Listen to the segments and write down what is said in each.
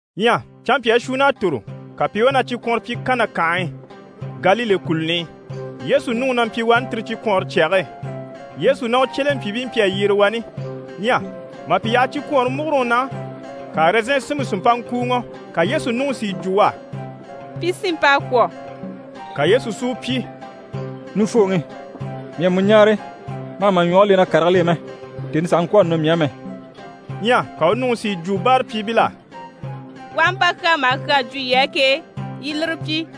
Ɲyɛ canmpyaa shuunn'à tòro, ka pi i wá na cikwɔnrɔ pyi Kana kànhe e, Galile kùluni i. Yesu nuŋi na mpyi wani tire cikwɔɔnre cyage e. Yesu ná u cyelempyiibii mpyi a yyere wani. Ɲyɛ mà pi yaha cikwɔɔnre múguroŋi na, ka ɛrɛzɛn sinmpe si mpa ŋkùuŋɔ. Ka Yesu nuŋi si yi jwo u á: «Pi sinmp'à kwɔ̀.» Ka Yesu si u pyi: «Nufooŋi, mii à mu ɲáare, ma hà ma ɲwɔge le na karigil'e mɛ. Tèni sàha ŋkwɔ̀ a nɔ mii á mɛ.» Ɲyɛ ka u nuŋi si yi jwo báarapyiibil'á: «U aha mpa kyaa maha kyaa jwo yii á ke, yii i lire pyi.»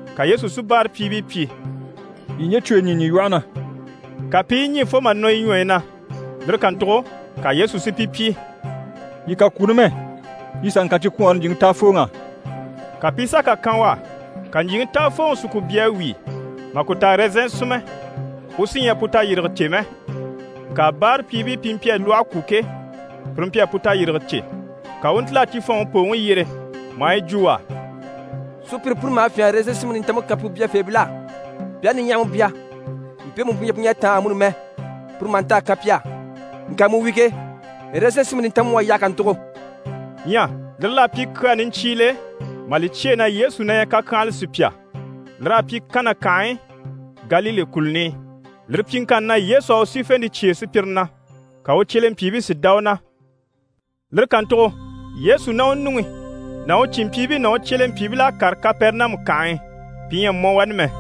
Ka Yesu si báarapyiibii pyi: «Yii ɲje cwoyi ɲî ɲî lwɔhe na.» Ka pi i yi ɲî fo mà nɔ yi ɲwɔyi na. Lire kàntugo ka Yesu si pi pyi: «Yii kà kwó numɛ, yii sà ŋkan cikwɔɔnre ɲjyìŋi táafooŋ'á.» Ka pi i sà kà kan u á. Ka ɲjyìŋi táafooŋi si lwɔhe bya a wíi, mà ku ta ɛrɛzɛn sinmɛ, u sí ɲyɛ a pu tayirige cè mɛ. Ŋka báarapyiibii pi mpyi a lwɔhe kwó ke, pire mpyi a pu tayirige cè. Ka u u ntíl'a cifɔnŋi pooŋi yyere, maa yi jwo u á: «Sùpyire puni maha fyânha a ɛrɛzɛn sinmpe nintanmpe kan pu byafeebil'á, pi aha niɲyahama bya, mpe pu ɲyɛ pu ɲyɛ a táan amuni mɛ, puru maha nta a kan pi á. Ŋka mu wi ke, ɛrɛzɛn sinmpe nintanmpe mu à yaha kàntugo!» Ɲyɛ lire l'à pyi kyaa niɲcyiile, mà li cyêe na Yesu na ɲyɛ kakyanhala sùpya. Lir'à pyi Kana kànhe e, Galile kùluni i. Lire pyiŋkanni na, Yesu à u sífente cyêe sùpyire na, ka u cyelempyiibii si dá u na. Lire kàntugo Yesu ná u nuŋi ná u cìnmpyiibii ná u cyelempyiibil'à kàre Kapɛrɛnamu kànhe e. Pi ɲyɛ a mɔ wani mɛ.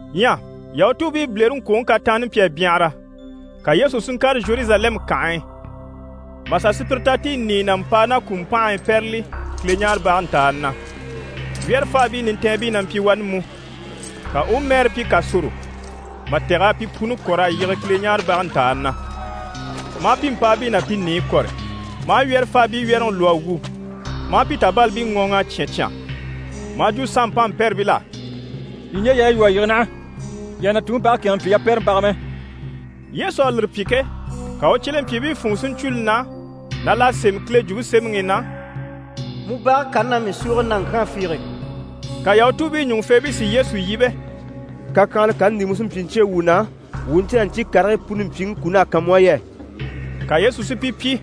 Ɲyɛ Yahutuubii bilereŋkwoŋi kataanni mpyi a byanhara. Ka Yesu si ŋkàre Zheruzalɛmu kànhe e, mà sà sùpyire ta ti i nìiyɛ ná mpàa ná kùmpanhii pɛ́rɛli Kileɲaarebage ntàani na, wyɛ́rɛfaabii nintɛɛnbii na mpyi wani mú. Ka u u mɛɛrɛ pyi kàsoro mà tɛ̀g'a pi puni kɔ̀r'a yige Kileɲaarebage ntàani na, maa pi mpàabii ná pi nìiyi kɔ̀rɔ, maa wyɛ́rɛfaabii wyɛ́rɛŋi lwɔ́ a wu, maa pi tàbalibii ŋɔɔŋ'a cyán cyán. Maa jwo sanmpanmpɛrɛbil'á: «Yii ɲje yaayi lwɔ́ a yige naha, yii àha na Tuŋi bage kɛ̂ɛnŋɛ mpyi yapɛrɛmbaga mɛ.» Yesu à lire pyi ke, ka u cyelempyiibii funŋɔ si ɲcwo li na na l'à sémɛ Kile Jwumpe Semɛŋi i na: «Mu bage kani na mii súuge naŋkyaan fiige.» Ka Yahutuubii ɲùŋufeebii si Yesu yíbe: «Kakyanhala kani ndi mu sí n‑pyi n‑cyêe wuu na, wuu u ɲcè na ɲcyii karigii puni mpyiŋi kun'à kan mu á yɛ?» Ka Yesu si pi pyi: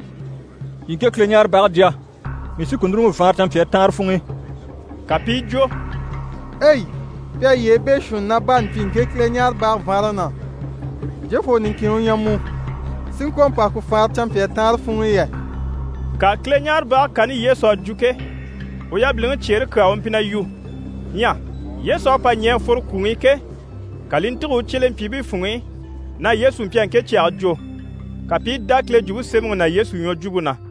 «Yii ŋke Kileɲaarebage jya, mii sí ku núruŋɔ n‑faanra canmpyaa taanre funŋ'i!» Ka pi i jwo: «Ei! Pi à yyee beeshuunni ná baani pyi ŋke Kileɲaarebage vaanraŋi na. Jofoo niŋkin u ɲyɛ mu, si ŋkwɔ̀ mpa ku faanra ŋkwɔ̀ canmpyaa taanre funŋ'i yɛ?» Ŋka Kileɲaarebage kani Yesu à jwo ke, u yabiliŋi cyeere kyaa u mpyi na yu. Ɲyɛ Yesu à pa ɲɛ̀ a fworo kwùŋi i ke, ka li i ntîge u cyelempyiibii funŋ'i na Yesu mpyi a ŋke cyage jwo. Ka pi i dá Kile Jwumpe Semɛŋi ná Yesu ɲwɔjwumpe na.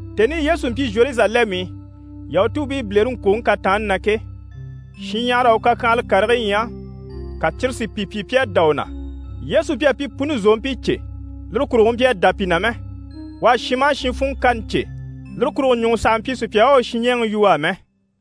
Tèni i Yesu mpyi Zheruzalɛmu i Yahutuubii bilereŋkwoŋi kataanni na ke, shinɲyahara à u kakyanhala karigii ɲya, ka cyire si pi pyi pi à dá u na. Yesu mpyi a pi puni zòompii cè, lire kurugo u mpyi a dá pi na mɛ. U à shin maha shin funŋɔ kani cè, lire kurugo ɲùŋɔ sàha mpyi sùpya u à u supyiɲɛɛŋi yu u á mɛ.